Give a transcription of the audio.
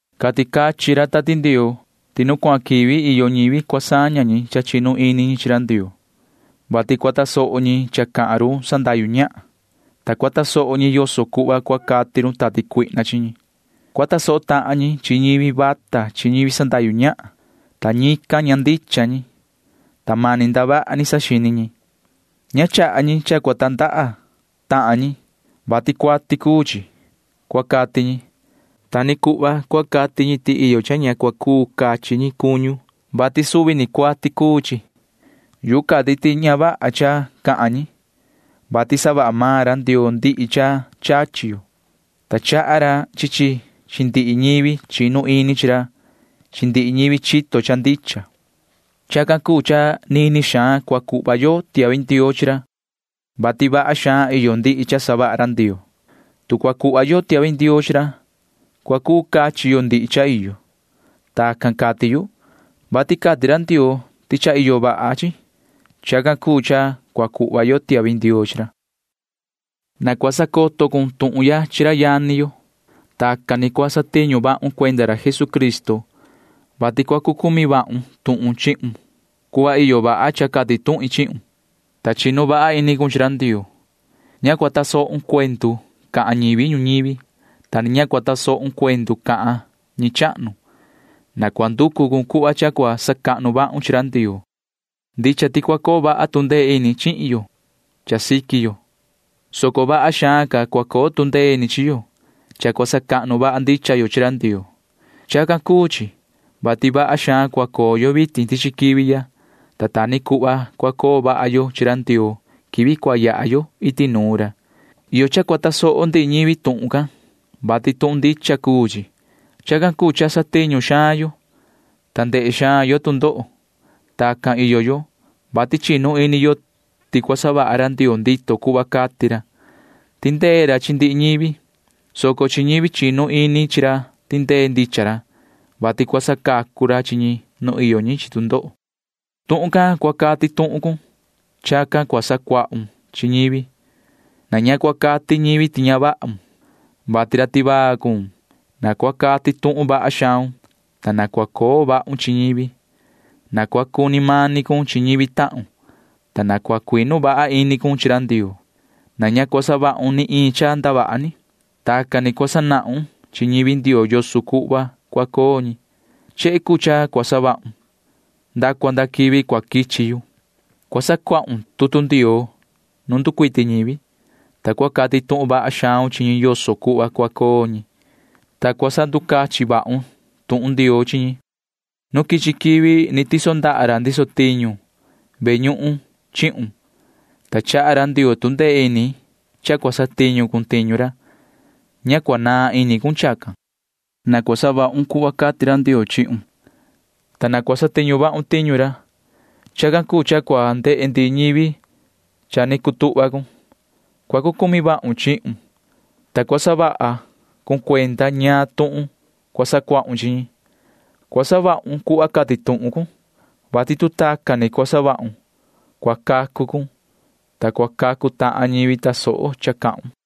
Cati cachin ra Tati Ndioo ti nu cuahan quivi iyo ñivi cua saña cha chinu ini ñi chi ra Ndioo, vati cua tasoho ñi cha cahan run sandahyu ñahan, ta cua tasoho ñi yoso cuhva cua cati run tati cuihna chi ñi. Cua tasoho tahan ñi chi ñivi vata chi ñivi sandahyu ñahan, ta ñican ña ndicha ñi, ta mani ndavaha ni saxini ñi. Ña chaha ñi cha cua tandaha tahan ñi, vati cuati cuu chi, cua cati ñi. Ta ni cuhva cua cati ñi ti iyo cha ña cua cuu cachi ñi cuñu, vati suvi ni cuati cuu maan chi. Yuhu cati ti ña vaha cha cahan ñi, vati savaha maan ra Ndioo ndihi cha chachi yo, ta chaha ra chi chi chi ndihi ñivi chinu ini chi ra chi ndihi ñivi chito cha ndicha. Chacan cuu cha nini xaan cua cuhva yo tiahvi ndioo chi ra, vati vaha xaan iyo ndihi cha savaha ra Ndioo. Tu cua cuhva yo tiahvi ndioo chi ra, cua cuu cachi yo ndihi cha iyo. Tacan cati yu, vati cati ra Ndioo ti cha iyo vaha chi. Chacan cuu cha cua cuhva yo tiahvi ndioo chi ra. Na cua sacoto cun tuhun ya chi ra yani yo. Tacan ni cua satiñu vahun cuenda ra Jesucristo, vati cua cu cumi vahun tuhun chihun cuhva iyo vaha cha cati tuhin chihun, ta chinu vaha ini cun chi ra Ndioo. Ña cua tasohun cuendu cahan ñivi ñuñivi, ta ni ña cua tasohun cuendu cahan ñi chahnu. Na cua nducu cun cuhva cha cua sacahnu vahun chi ra Ndioo. Ndicha ti cua coo vaha tu ndee ini chihin yo cha siqui yo, soco vaha xaan ca cua coo tu ndee ini chi yo cha cua sacahnu vaha ndicha yo chi ra Ndioo. Chacan cuu chi, vati vaha xaan cua coo yo vitin tichi quivi ya, ta ta ni cuhva cua coo vaha yo chi ra Ndioo quivi cua yaha yo iti nuun ra. Iyo cha cua tasoho ndihi ñivi tuhun can, vati tuhun ndicha cuu chi. Chacan cuu cha satiñu xaan yo, ta ndehe xaan yo tu ndoho. Tacan iyo yo, vati chinu ini yo ti cua savaha ra Ndioo ndito cuhva cati ra. Tindee ra chi ndihi ñivi, soco chi ñivi chinu ini chi ra tindee ndicha ra, vati cua sacacu ra chi ñi nu iyo ñi chi tu ndoho. Tuhun can cua cati tuhun cun. Chacan cua sacuahun chi ñivi. Na ña cua cati ñivi ti ña vahun, vati ra tivaa cuun. Na cua cati tuhun vaha xaun, ta na cua coo vahun chi ñivi. Na cua cuni mani cun chi ñivi tahun, ta na cua cuinu vaha ini cun chi ra Ndioo. Na ña cua savahun ni iin cha ndavaha ni. Tacan ni cua sanahun chi ñivi Ndioo yoso cuhva cua coo ñi. Chehe cuu cha cua savahun nda cua nda quivi cua quichi yu. Cua sacuahun tutu Ndioo nu nducuiti ñivi, ta cua cati tuhun vaha xaun chi ñi yoso cuhva cua coo ñi, ta cua sanducachin vahun tuhun Ndioo chi ñi. Nu quichi quivi ni tiso ndaha ra ndiso tiñu ve ñuhun chihun, ta chaha ra Ndioo tu ndee ini cha cua satiñu cun tiñu ra. Ña cua naan ini cun chacan. Na cua savahun cuhva cati ra Ndioo chihun, ta na cua satiñu vahun tiñu ra. Chacan cuu cha cua ndehe ndihi ñivi cha ni cutuhva cun. Cua cu cumi vahun chihun, ta cua sahun cuenda ñaan tuhun cua sacuahun chi ñi. Cua savahun cuhva cati tuhun cun, vati tu tacan ni cua savahun, cua cacu cun, ta cua cacu tahan ñivi tasoho cha cahun.